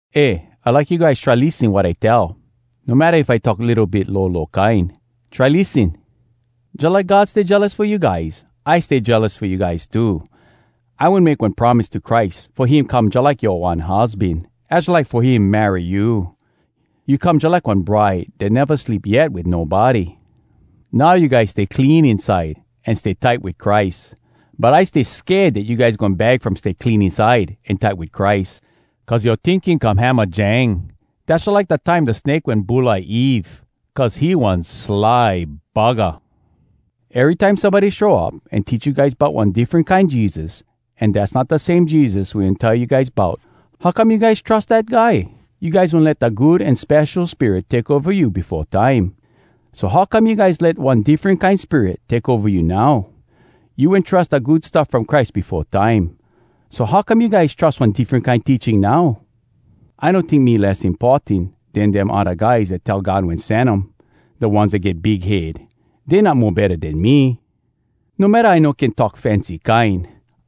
Eh, I like you guys try lissen wat I tell, no matta if I talk litto bit lolo kine. Try lissen! Jalike God stay jealous fo you guys, I stay jealous fo you guys too. I wen make one promise to Christ fo him come jalike yoa one husban. Az jalike fo him marry you. You come jalike one bride dat neva sleep yet wit nobody. Now you guys stay clean inside an stay tight wit Christ. But I stay sked dat you guys goin bag from stay clean inside an tight wit Christ. Cuz yoa tinking come hamajang. Dass jalike da time da snake wen bulai Eve cuz he one sly buggah! Erytime somebody show up an teach you guys bout one diffren kine Jesus, an dass not da same Jesus we wen tell you guys bout, how come you guys trus dat guy? You guys wen let da Good An Spesho Spirit take ova you befo time. So how come you guys let one diffren kine spirit take ova you now? You wen trus da Good Stuff From Christ befo time, so how come you guys trus one diffren kine teaching now? I no tink me less importan den dem odda guys dat tell God wen sen um, da ones dat get big head. Dey not mo betta den me. No matta I no can talk fancy kine,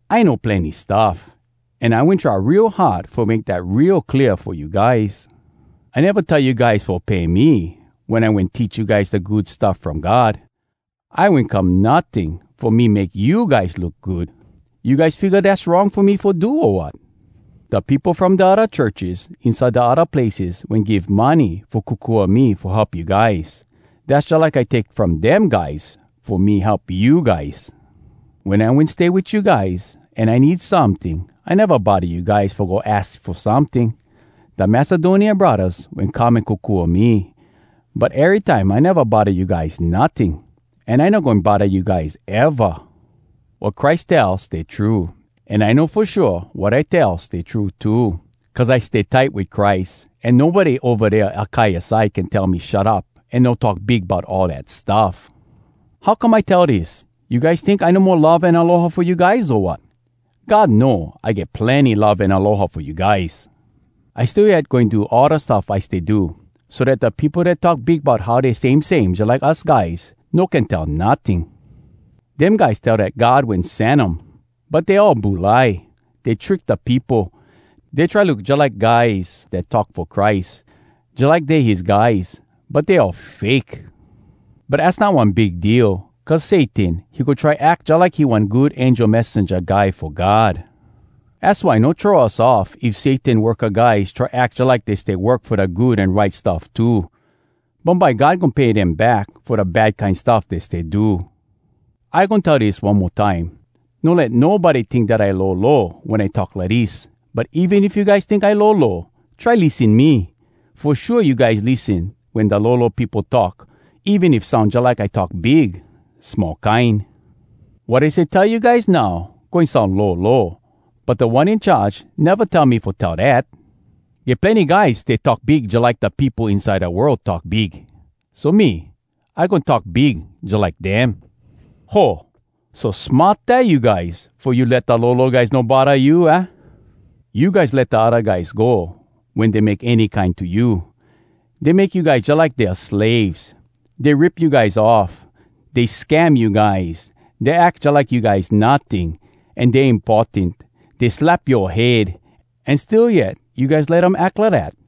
I know plenny stuff. An I wen try real hard fo make dat real clear fo you guys. I neva tell you guys fo pay me wen I wen teach you guys da Good Stuff From God. I wen come notting fo me make you guys look good. You guys figga dass wrong fo me fo do, o wat? Da peopo from da odda churches inside da odda places wen give money fo kokua me fo help you guys. Dass jalike I take from dem guys fo me help you guys. Wen I wen stay wit you guys an I need someting, I neva bodda you guys fo go aks fo someting. Da Macedonia braddahs wen come an kokua me. But erytime I neva bodda you guys notting, an I no goin bodda you guys eva. Wat Christ tell stay true, an I know fo shua wat I tell stay true too, cuz I stay tight wit Christ. An nobody ova dea Akaia side can tell me shut up an no talk big bout all dat stuff. How come I tell dis? You guys tink I no mo love an aloha fo you guys, o wat? God know I get plenny love an aloha fo you guys. I still yet goin do all da stuff I stay do, so dat da peopo dat talk big bout how dey same same jalike us guys, no can tell notting. Dem guys tell dat God wen sen um, but dey all bulai. Dey trick da peopo. Dey try look jalike guys dat talk fo Christ, jalike dey his guys, but dey all fake. But az not one big deal. Cuz Satan, he go try ack jalike he one good angel messenja guy fo God. Az why no throw us off if Satan worka guys try ack jalike dey stay work fo da good an right stuff too. Bumbye God goin pay dem back fo da bad kine stuff dey stay do. I goin tell dis one mo time: No let nobody tink dat I lolo wen I talk lidis. But even if you guys tink I lolo, try lissen me. Fo shua you guys lissen wen da lolo peopo talk, even if soun jalike I talk big small kine. Wat I stay tell you guys now, goin soun lolo, but Da One In Charge neva tell me fo tell dat. Get plenny guys stay talk big jalike da peopo inside da world talk big, so me, I goin talk big jalike dem. Ho! So smart eh you guys! Fo you let da lolo guys no bodda you, aah? You guys let da odda guys go wen dey make any kine to you. Dey make you guys jalike dea slaves. Dey rip you guys off. Dey scam you guys. Dey ack jalike you guys notting, an dey importan. Dey slap yoa head. An still yet you guys let um ack lidat.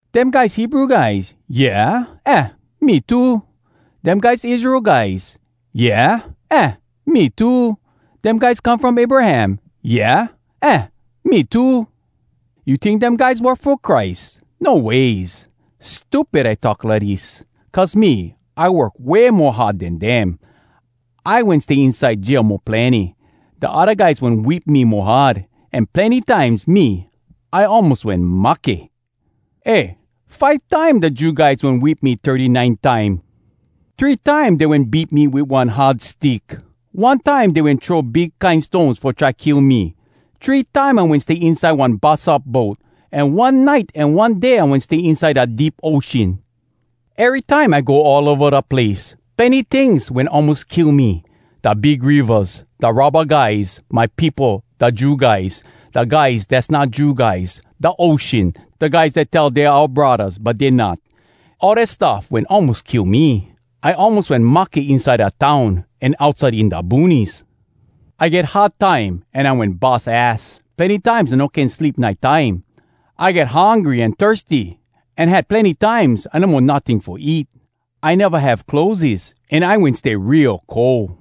Dem guys Hebrew guys? Yeah, aah, me too. Dem guys Israel guys? Yeah, aah, me too. Dem guys come from Abraham? Yeah, aah, me too. You tink dem guys work fo Christ? No ways! Stupid, I talk lidis! Cuz me, I work way mo hard den dem. I wen stay inside jail mo plenny. Da odda guys wen whip me mo hard. An plenny times me, I almos wen mahke. Eh, five time da Jew guys wen whip me thirty-nine time. Three time dey wen beat me wit one hard stick. One time dey wen throw big kine stones fo try kill me. Three time I wen stay inside one bus up boat, an one nite an one day I wen stay inside da deep ocean. Erytime I go all ova da place. Plenny tings wen almos kill me: da big rivas, da robba guys, my peopo da Jew guys, da guys dass not Jew guys, da ocean, da guys dat tell dey oua braddahs but dey not. All dat stuff wen almos kill me. I almos wen mahke inside da town an outside in da boonies. I get hard time, an I wen bus ass. Plenny times I no can sleep nite time. I get hungry an thirsty, an had plenny times I no mo notting fo eat. I neva have clotheses, an I wen stay real cold.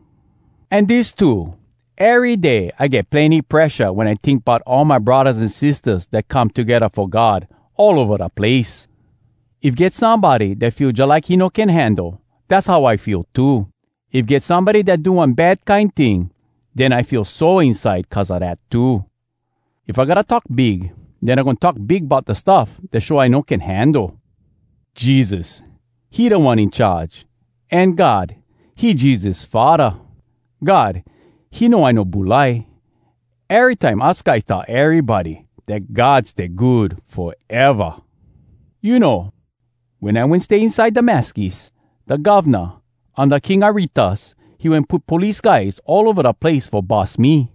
An dis too: ery day I get plenny presha wen I tink bout all my braddahs an sistahs dat come togedda fo God all ova da place. If get somebody dat feel jalike he no can handle, dass how I feel too. If get somebody dat do one bad kine ting, den I feel sore inside cuz a dat too. If I gotta talk big, den I goin talk big bout da stuff dat show I no can handle. Jesus, he Da One In Charge, an God, he Jesus Faddah. God, he know I no bulai. Erytime us guys tell erybody dat God stay good foeva. You know, wen I wen stay inside Damascus, da govna unda King Aretas, he wen put police guys all ova da place fo bus me.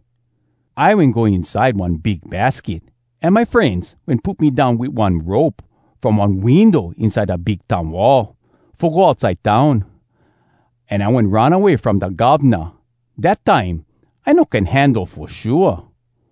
I wen go inside one big basket, an my frenz wen put me down wit one rope from one window inside da big town wall, fo go outside town. An I wen run away from da govna. Dat time, I no can handle fo shua!